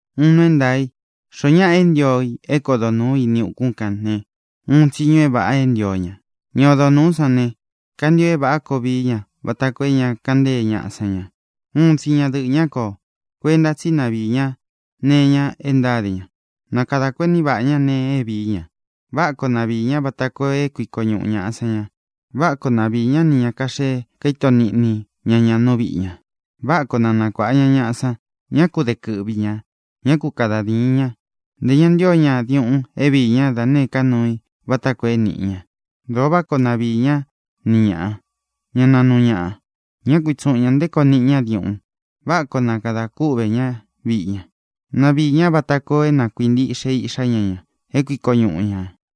Uun nuu é ntaā í: xoó ñaꞌa é ntio i é kodo nūú ini ukún ne, uun tsiñu é vāꞌa é ntio ña. Ña odo nūú san ne, kantio é vāꞌá koo vií ña vata koo é ña kaꞌan ntée ñaꞌa san ña. Uun tsi ñadɨꞌɨ̄ ñá koo. Kuenta tsí na viī ñá nee iña e ntáde ña. Na kadā kuení vaꞌā ñá nēe é viī ña. Váꞌa koo na viī ñá vata koo é kuiko ñuꞌu ñāꞌa san ña. Váꞌa koo na viī ñá nī ña kaxee kaíto niꞌni ña ña nú viꞌi ña. Váꞌa koo na nakuāꞌa ña ñaꞌa san. Ñá ku de kɨꞌvi ñā. Ñá ku kada dīin ña. Ntē ña ntío ña diuꞌun é viī ñá da nēé ka nuu i vata koo é nīꞌi ña. Dōo váꞌa koo na viī ñá ni ñāꞌa. Ñá nāa núu ña. Ñá ku itsuꞌūn ña nté koo niꞌi ñá diuꞌun. Váꞌa koo na kadā kúꞌvē ñá viꞌi ña. Na viī ñá vata koo é na kuīntiꞌxe iꞌxá ña ña, é kuiko ñuꞌu ñā.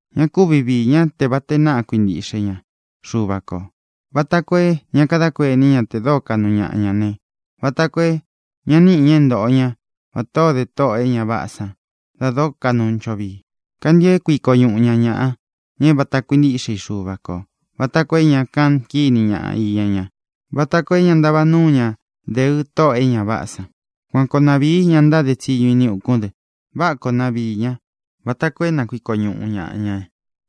Ña kúvi viī ñá te vata e náꞌa kuintíꞌxe ña Xuva kō, vata koo é ña kadá kuení ña te dóo kaꞌnu ñaꞌa ña ne, vata koo é ña níꞌi ña é ntoꞌo ña vatā o dé tóꞌō e ña váꞌā san da dóo kaꞌnu ncho vii. Kantio é kuiko ñuꞌu ñāꞌa ña, ña é vāta kuintíꞌxe i Xuva kō, vata koo é ña kaꞌan kíni ña iña ña, vata koo é ña ntava núu ña deɨ tóꞌō e ña váꞌā san. Kuan koo na vīí ña ntáde tsiñu ini ukún dɨ. Váꞌa koo na viī ñá vata koo é na kuiko ñuꞌu ñāꞌa ña.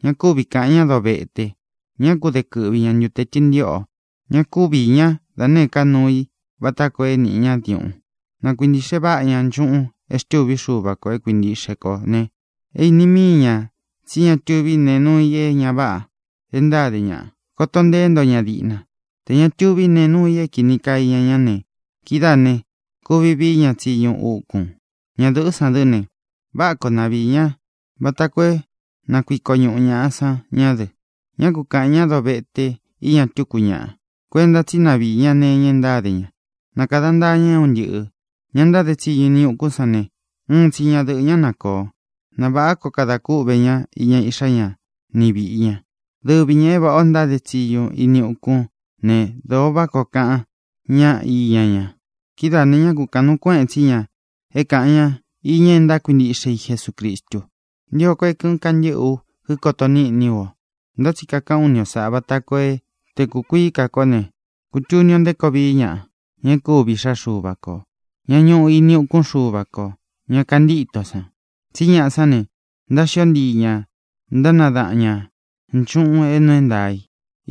Ña kúvi kāꞌan ñá dovete. Ñá ku de kɨꞌvi ña ntute tɨntiꞌō. Ñá ku viī ñá da nēé ka nuu i vata koo é nīꞌi ñá diuꞌun. Na kuīntiꞌxe váꞌa ña nchuꞌun e xtûví Xuva kō é kuintiꞌxe kō ne, é īni míi ña tsí ña tuví nee nuu i é ña váꞌa e ntáde ña. Koto nteé nto ña diꞌna. Tē ña tuví nee nuu i é kīni kaa iña ñá ne, kidáā ne, kuvi vií ña tsiñu ukun. Ñadɨ̄ꞌɨ́ san dɨ́ ne, váꞌa koo na viī ñá vata koo é na kuiko ñuꞌu ñāꞌa san ñá dɨ. Ñá ku kāꞌan ñá dovete iña tuku ñáꞌa. Kuenta tsí na viī ñá nee iña e ntáde ña. Na kāda ntaa ña é un ntɨꞌɨ̄. Ña e ntáde tsiñu ini ukún san ne, uun tsi ñadɨꞌɨ̄ ñá na kōo. Na vāꞌá koo kadā kúꞌvē ñá iña iꞌxá ña ni vīꞌi ña. Dɨvi ñā é vāꞌá ō ntáde tsiñu ini ukún ne, dōo váꞌa koo kaꞌan ñáꞌa iña ña. Kidáā ne, ñá kūkaꞌan nuu kuéꞌen tsí ña é kāꞌan ñá iña e ntákuintiꞌxe i Jesucristu. Ntio ko é kɨ̄ꞌɨn kantɨ́ꞌɨ ú kíkoto níꞌni ú o, ntá tsi kakaꞌán u ni o sāꞌá vata koo é, te kūkuií ka kó ne, kutuni o nté koo vií ñaꞌa, ña e kúvi iꞌxá Xuva kō, ña ñuꞌu ini ukún Xuva kō, ña kantíto san. Tsí ña sāꞌá ne, ntáxió ntii ña, ntánadaꞌan ñā nchuꞌun é nuu é ntaā í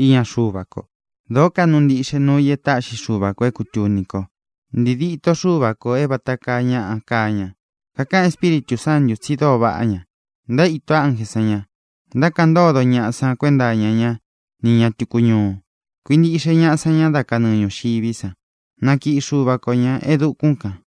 iña Xuva ko. Dōó kaꞌnu ntiꞌxe nuu i e táꞌxi Xuva kō é kūtuni ko: Ntiī dîtó Xuva kō é vata kaa ñaꞌa kaa ña. Kakaꞌan Espíritū Sántū tsi dóo vaꞌá ña. Ntaíto ánjē san ña. Ntákaꞌan ntódo ñaꞌa san kuenta iña ña ni ña tuku ñúu. Kuīntiꞌxe ñaꞌa san ña dá kanɨɨ ñūxiví san. Nakiꞌi Xuva ko ñā e dukún kān.